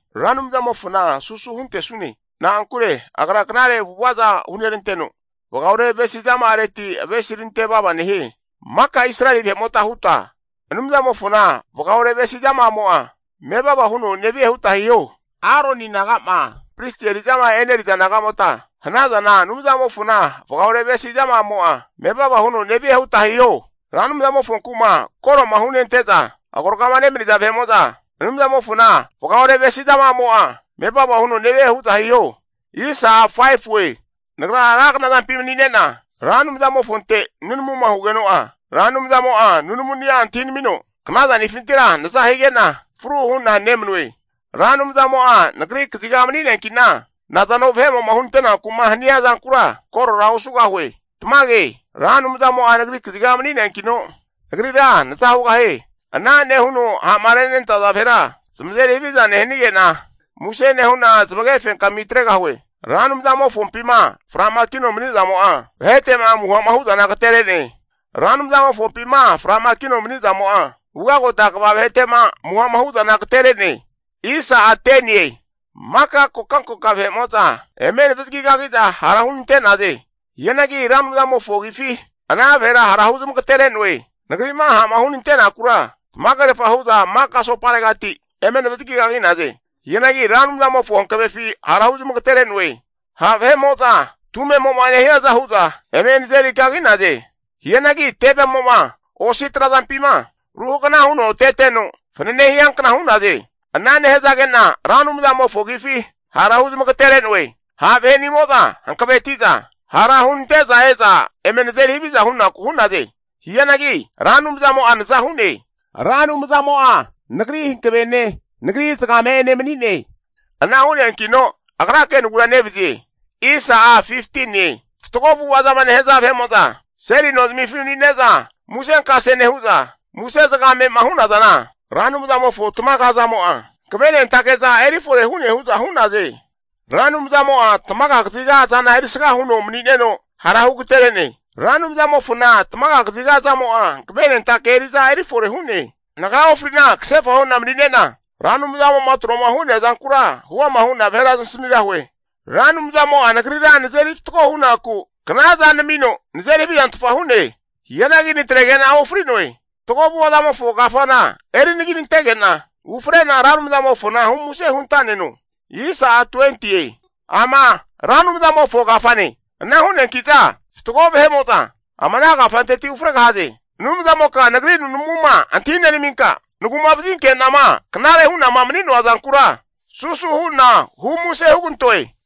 Ra Anumzamofona susu huntesune, na'ankure Agra knare avu'avaza huneranteno vagaore avesi zama'areti avesirante vava nehie. Maka Israeli vahe'mota huta, Anumzamofona vagaore avesi zama'amo'a mevava huno nevie huta hiho. Aroni naga'ma pristi eri'zama e'neriza nagamota hanazana, Anumzamofona vagaore avesi zama'amo'a mevava huno nevie huta hiho. Ra Anumzamofonku'ma koro'ma hunente'zaagoragama nemaniza vahe'mota Anumzamofona vagaore avesi zama'amo'a mevava huno nevie hu'za hiho. Nagra ra knazampima manine'na Ra Anumzamofonte nunamuma hugeno'a, Ra Anumzamo'a nunamuni'a antahinamino knazanifintira naza hige'na fru hu'na nemanue. Ra Anumzamo'a nagri kaziga mani'neanki'na, nazano vahe'mo'ma hunante'naku'ma hania zankura, korora osugahue. Tamage, Ra Anumzamo'a nagri kaziga mani'neankino, nagrira naza hugahie. Ana nehuno ha'ma renenantaza vahera zamazeri haviza nehanige'na, muse nehu'na zamage fenkami atregahue. Ra Anumzamofompima fra'makino mani'zamo'a, vahete'ma amuha'ma hu'zana agatere'ne. Ra Anumzamofompima fra'makino mani'zamo'a, ugagota kva vahete'ma amuha'ma hu'zana agatere'ne. Maka kokankoka vahe'mo'zama eme navazagi kagi'za hara hunante'naze. Hianagi Ra Anumzamofo agifi ana vahera hara huzmagatere'noe. Nagri'ma ha'ma hunante'nakura tamagerfa hu'za maka asoparegati eme navazagi kagi'naze. Hianagi Ra Anumzamofo hankavefi hara huzmagatere'noe. Ha' vahe'mo'za tumemo'ma nehiaza hu'za eme nazeri kagi'naze. Hianagi tevemo'ma osi trazampima ruhagana huno teteno fanane hiankna hu'naze. Ana nehazage'na Ra Anumzamofo agifi hara huzmagatere'noe. Ha' vahenimo'za hankaveti'za hara hunante'za e'za eme nazeri haviza hunaku hu'naze. Hianagi Ra Anumzamo'a naza hu'ne. Ra Anumzamo'a nagri hankavene, nagri zagame'ene mani'ne. Ana hu'neankino agrake naguranevazie. Fatgo avu'ava zama nehaza vahe'mo'za seli nozamifi manine'za musenkase nehu'za, muse zagame'ma hu'nazana, Ra Anumzamofo tamaga azamo'a, hankavenentake'za eri fore hu'ne hu'za hu'naze. Ra Anumzamo'a tamaga kaziga azana eri sga huno mani'neno hara hugaterene. Ra Anumzamofona tamaga kaziga azamo'a hankavenentake eri'za eri fore hu'ne. Nagra ofri'na kasefa hu'na manine'na, Ra Anumzamo'ma tro'ma hu'nea zankura huama hu'na vahera zamasamigahue. Ra Anumzamo'a nagrira nazeri fatgo hunaku knaza namino nazeri havizantfa hu'ne. Hianagi natrege'na ofri'noe. Fatgo avu'avazamofo kafana eri anaginantege'na, ufre'na Ra Anumzamofona humuse hunta'neno. Ama Ra Anumzamofo kafane. Ana hu'neanki'za fatgo vahe'mo'za ama ana kafanteti ufregahaze. Anumzamoka nagri nunamuma antahi nenaminka, nagu'mavazinke'nama knare hu'nama mani'noa zankura susu hu'na humuse hugantoe.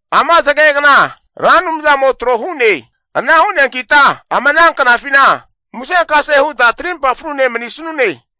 Ama zagegna Ra Anumzamo tro hu'ne. Ana hu'neankita ama ana knafina musenkase huta trimpa frune manisanune.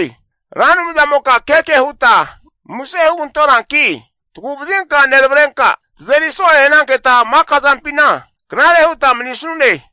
Ra Anumzamoka keke huta muse hugantonanki, tagu'vazinka neravrenka, tazeri so'e hananketa maka zampina knare huta manisanune.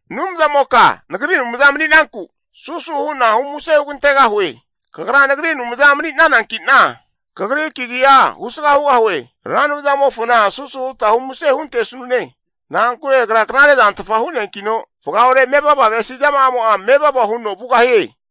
Anumzamoka nagri Anumza mani'nanku, susu hu'na humuse hugantegahue. Kagra nagri Anumza mani'nananki'na, kagri kagi'a husga hugahue. Ra Anumzamofona susu huta humuse huntesanune. Na'ankure agra knare zantfa hu'neankino, vagaore mevava avesi zama'amo'a mevava huno vugahie.